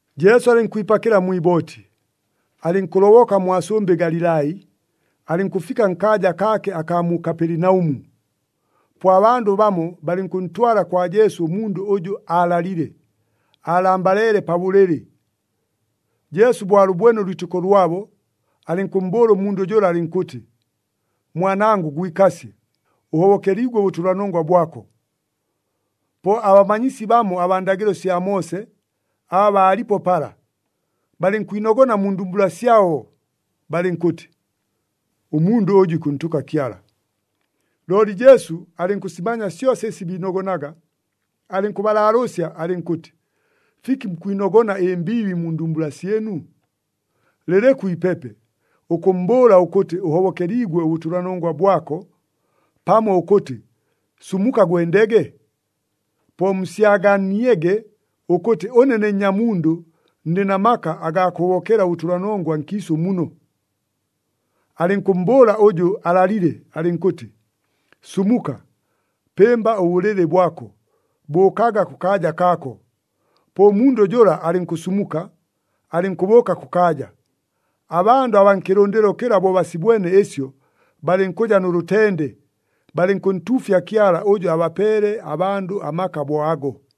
Jesu alɨnkwipakɨla mwi ibooti, alɨnkʉloboka mwa sʉmbɨ Galilai, alɨnkʉfika nkaaja kaake akaa mu Kapelinaʉmu. Po abandʉ bamo balɨnkʉntwala kwa Jesu ʉmundʉ ʉjʉ aalalile, aalambaleele pa bʉlɨlɨ. Jesu bo alʉbwene ʉlwitɨko lwabo, alɨnkʉmmbʉʉla ʉmundʉ jʉla alɨnkʉtɨ, “Mwanangʉ gwikasye! Ʉhobokeliigwe ʉbʉtʉlanongwa bwako.” Po abamanyisi bamo abaa ndagɨlo sya Moose, aba baalipo pala, balɨnkwinogona mu ndumbula syabo, balɨnkʉtɨ, “Ʉmundʉ ʉjʉ ikʉntʉka Kyala!” Looli Jesu alɨnkʉsimanya syosa ɨsi biinogonaga, alɨnkʉbalaalʉʉsya alɨnkʉtɨ, “Fiki mukwinogona ɨmbiibi mu ndumbula syɨnu? Lɨlɨkʉ ipepe, ʉkʉmmbʉʉla ʉkʉtɨ, ‘Ʉhobokeliigwe ʉbʉtʉlanongwa bwako,’ pamo ʉkʉtɨ, ‘Sumuka, gwendege’? Po musyaganiege ʉkʉtɨ ʉne ne Nnyamundʉ ndɨ na maka agaa kʉhobokela ʉbʉtʉlanongwa nkiisʉ muno...” Alɨnkʉmmbʉʉla ʉjʉ aalalile alɨnkʉtɨ, “Sumuka, pɨmba ʉbʉlɨlɨ bwako, bʉʉkaga kʉkaaja kaako.” Po ʉmundʉ jʉla alɨnkʉsumuka, alɨnkʉbʉʉka kʉkaaja. Abandʉ abaa nkɨlʉndɨlo kɨla bo basibwene ɨsyo, balɨnkʉja nʉ lʉtende. Balɨnkʉntuufya Kyala ʉjʉ abapeele abandʉ amaka bo ago.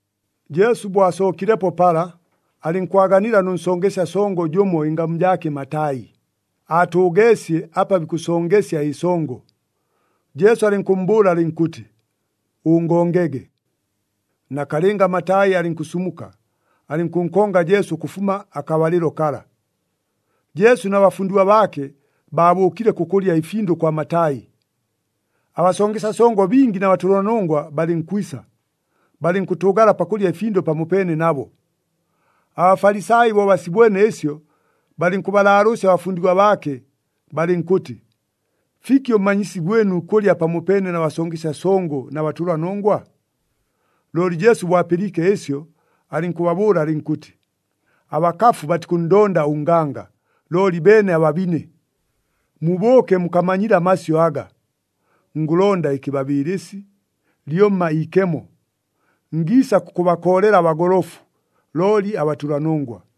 Jesu bo asookilepo pala, alɨnkwaganila nʉ nsongesya songo jʉmo, ɨngamu jaake Matai, aatʉʉgeesye apa bikʉsongesya ɨsongo. Jesu alɨnkʉmmbʉʉla alɨnkʉtɨ, “Ʉngongege.” Nakalɨnga Matai alɨnkʉsumuka, alɨnkʉnkonga Jesu ʉkʉfuma akabalɨlo kala. Jesu na bafundigwa baake baabʉʉkile kʉkʉlya ɨfindʉ kwa Matai. Abasongesya songo bingi na batʉlanongwa balɨnkwisa, balɨnkʉtʉʉgala pakʉlya ɨfindʉ pamopeene nabo. ABafalisai bo basibwene ɨsyo, balɨnkʉbalaalʉʉsya abafundigwa baake, balɨnkʉtɨ, “Fiki ʉmmanyisi gwɨnu ikʉlya pamopeene na basongesya songo na batʉlanongwa?” Looli Jesu bo apɨliike ɨsyo, alɨnkʉbabʉʉla alɨnkʉtɨ, “Abakafu batikʉnndonda ʉnganga, looli beene ababine! Mubʉʉke mukamanyile amasyʉ aga, ‘Ngʉlonda ɨkɨbabɨɨlɨsi, lyomma iikemo.’ Ngiisa kʉkʉbakoolela abagolofu, looli abatʉlanongwa.”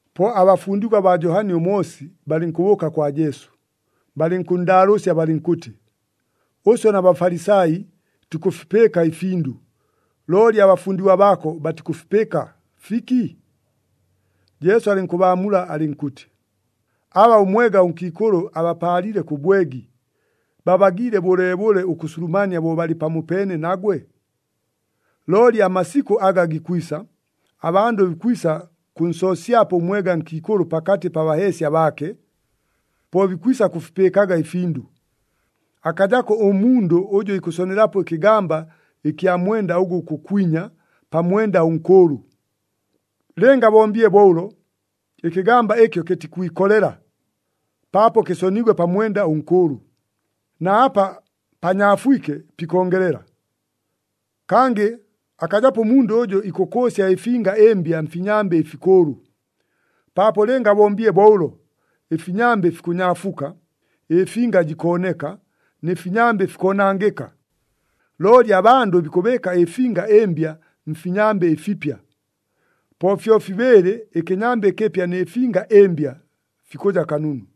Po abafundigwa baa Johani ʉMoosi balɨnkʉbʉʉka kwa Jesu, balɨnkʉnndaalʉʉsya balɨnkʉtɨ, “Ʉswe na Bafalisai tukʉfipɨɨka ɨfindʉ, looli abafundigwa baako batikʉfipɨɨka, fiki?” Jesu alɨnkʉbaamula alɨnkʉtɨ, “Aba ʉmwega nkiikʉlʉ abapaalile kʉ bwegi, babagiile bʉleebʉle ʉkʉsulumania bo balɨ pamopeene nagwe? Looli amasikʉ aga gikwisa, abandʉ bikwisa kʉnsoosyapo ʉmwega nkiikʉlʉ pakatɨ pa baheesya baake. Po bikwisa kʉfipɨɨkaga ɨfindʉ. Akajako ʉmundʉ ʉjʉ ikʉsonelapo ɨkɨgamba ɨkya mwenda ʉgʉ gukʉkwinya, pa mwenda ʉnkʉʉlʉ. Lɨnga abombile bo ʉlo ɨkɨgamba ɨkyo kɨtikwikolela, paapo kɨsoniigwe pa mwenda ʉnkʉʉlʉ, na apa panyaafwike pikongelela. Kangɨ akajapo ʉmundʉ ʉjʉ ikʉkʉʉsya ɨfinga ɨmbya mfinyambɨ ɨfikʉʉlʉ. Paapo lɨnga abombile bo ʉlo, ɨfinyambɨ fikʉnyaafuka, ɨfinga jikooneka, nɨ finyambɨ fikoonangɨka. Looli abandʉ bikʉbɨɨka ɨfinga ɨmbya mfinyambɨ ɨfipya. Po fyofibɨɨlɨ ɨkɨnyambɨ ɨkɨpya nɨ finga ɨmbya fikʉja kanunu!”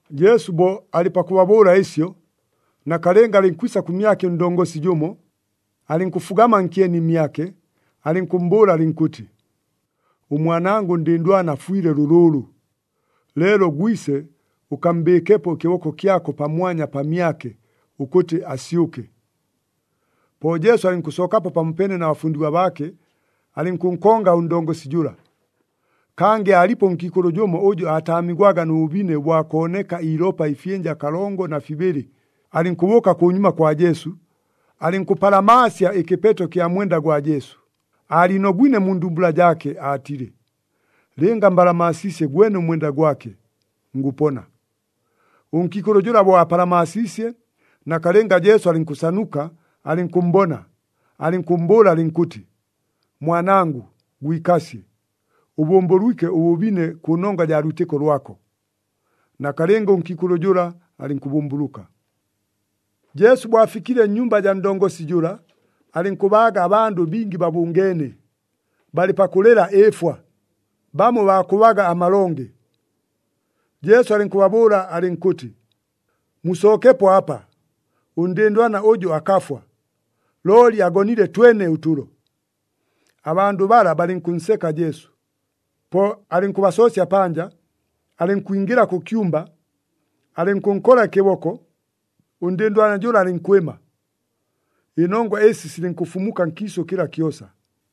Jesu bo alɨ pakʉbabʉʉla ɨsyo, nakalɨnga alɨnkwisa kʉmyake ʉndongosi jʉmo, alɨnkʉfugama nkyeni mmyake, alɨnkʉmmbʉʉla alɨnkʉtɨ, “Ʉmwanangʉ ʉndɨndwana afwile lʉlʉʉlʉ, leelo gwise, ʉkammbɨɨkepo ɨkɨboko kyako pamwanya pamyake, ʉkʉtɨ asyʉke.” Po Jesu alɨnkʉsookapo pamopeene na bafundigwa baake, alɨnkʉnkonga ʉndongosi jʉla. Kangɨ aalipo ʉnkiikʉlʉ jʉmo ʉjʉ aataamigwaga nʉ bʉbine bwa kooneka iilopa ɨfyɨnja kalongo na fibɨlɨ. Alɨnkʉbʉʉka kʉnyuma kwa Jesu, alɨnkʉpalamaasya ɨkɨpeto kya mwenda gwa Jesu, aaliinogwine mu ndumbula jaake, aatile, “Lɨnga mbalamaasiisye gwene ʉmwenda gwake, ngʉpona.” Ʉnkiikʉlʉ jʉla bo apalamaasiisye, nakalɨnga Jesu alɨnkʉsanuka, alɨnkʉmmbona, alɨnkʉmmbʉʉla alɨnkʉtɨ, “Mwanangʉ, gwikasye! Ʉbʉmbʉlwike ʉbʉbine kʉnongwa jaa lwitɨko lwako.” Nakalɨnga ʉnkiikʉlʉ jʉla alɨnkʉbʉmbʉlʉka. Jesu bo afikile nnyumba jaa ndongosi jʉla, alɨnkʉbaaga abandʉ bingi babʉngeene, balɨ pakʉlɨla ɨɨfwa, bamo baakʉbaga amalonge. Jesu alɨnkʉbabʉʉla alɨnkʉtɨ, “Musookepo apa! Ʉndɨndwana ʉjʉ akafwa, looli agonile twene ʉtʉlo!” Abandʉ bala balɨnkʉnseka Jesu. Po alɨnkʉbasoosya panja, alɨnkwingɨla kʉ kyumba, alɨnkʉnkola ɨkɨboko, ʉndɨndwana jʉla alɨnkwɨma. Ɨnongwa ɨsi silɨnkʉfumuka nkiisʉ kɨla kyosa.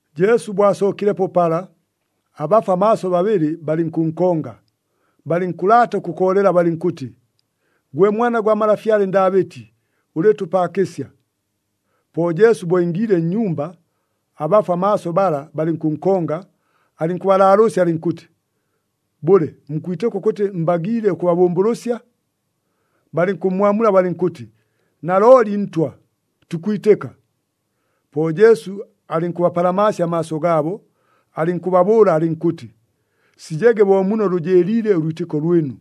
Jesu bo asookilepo pala, abafwa maaso babɨlɨ balɨnkʉnkonga, balɨnkʉlaata ʉkʉkoolela balɨnkʉtɨ, “Gwe Mwana gwa malafyale Ndaabɨti, ʉlɨɨtʉpaakɨsya!” Po Jesu bo ingiile nnyumba, abafwa maaso bala balɨnkʉnkonga, alɨnkʉbalaalʉʉsya alɨnkʉtɨ, “Bʉle, mukwitɨka ʉkʉtɨ mbagiile ʉkʉbabʉmbʉlʉsya?” Balɨnkʉmmwamula balɨnkʉtɨ, “Nalooli, Ntwa! Tukwitɨka.” Po Jesu alɨnkʉbapalamaasya amaaso gaabo, alɨnkʉbabʉʉla alɨnkʉtɨ, “Sijege bo muno lʉjɨɨliile ʉlwitɨko lwɨnu.”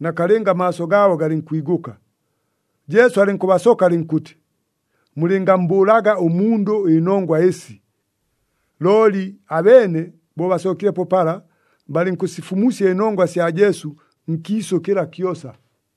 Nakalɨnga amaaso gaabo galɨnkwigʉka. Jesu alɨnkʉbasoka alɨnkʉtɨ, “Mulɨngammbʉʉlaga ʉmundʉ ɨnongwa ɨsi!” Looli abeene bo basookilepo pala, balɨnkʉsifumusya ɨnongwa sya Jesu nkiisʉ kɨla kyosa.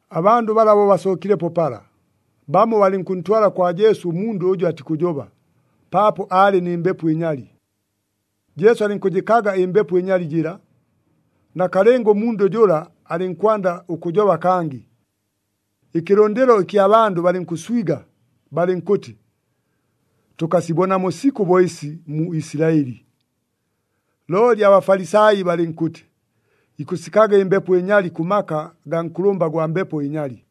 Abandʉ bala bo basookilepo pala, bamo balɨnkʉntwala kwa Jesu ʉmundʉ ʉjʉ atikʉjoba, paapo aalɨ nɨ mbepo ɨnyali. Jesu alɨnkʉjɨkaga ɨmbepo ɨnyali jɨla, nakalɨnga ʉmundʉ jʉla alɨnkwanda ʉkʉjoba kangɨ. Ɨkɨlʉndɨlo ɨkya bandʉ balɨnkʉswiga, balɨnkʉtɨ, “Tʉkasibonamo sikʉ bo ɨsi mu Isilaɨli!” Looli aBafalisai balɨnkʉtɨ, “Ikʉsikaga ɨmbepo ɨnyali kʉ maka agaa nkʉlʉmba gwa mbepo ɨnyali!”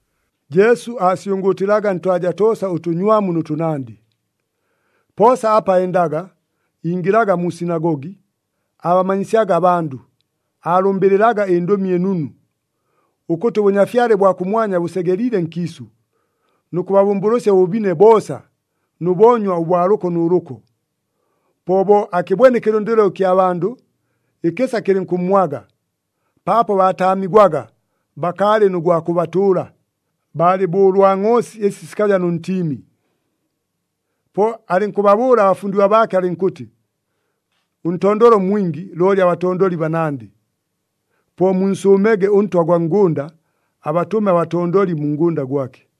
Jesu aasyʉngʉʉtɨlaga ntwaja toosa ʉtʉnywamu nʉ tʉnandɨ. Poosa apa endaga, ingɨlaga mu sinagogi, aabamanyisyaga abandʉ, aalʉmbɨlɨlaga ɨNdʉmi ɨNunu ʉkʉtɨ ʉBʉnyafyale bwa kʉmwanya bʉsegeliile nkiisʉ, nʉ kʉbabʉmbʉlʉsya ʉbʉbine boosa nʉ boonywa ʉbwa lʉko nʉ lʉko. Po bo akɨbwene ɨkɨlʉndɨlo ɨkya bandʉ, ɨkɨsa kɨlɨnkʉmmwaga, paapo baataamigwaga bakaalɨ nʉ gwa kʉbatʉʉla, baalɨ bo ʉlwa ngʼoosi ɨsi sikaja nʉ ntiimi. Po alɨnkʉbabʉʉla abafundigwa baake alɨnkʉtɨ, “Ʉntondolo mwingi, looli abatondoli banandɨ. Po munsʉʉmege ʉNtwa ʉgwa ngʉnda, abatʉme abatondoli mu ngʉnda gwake.”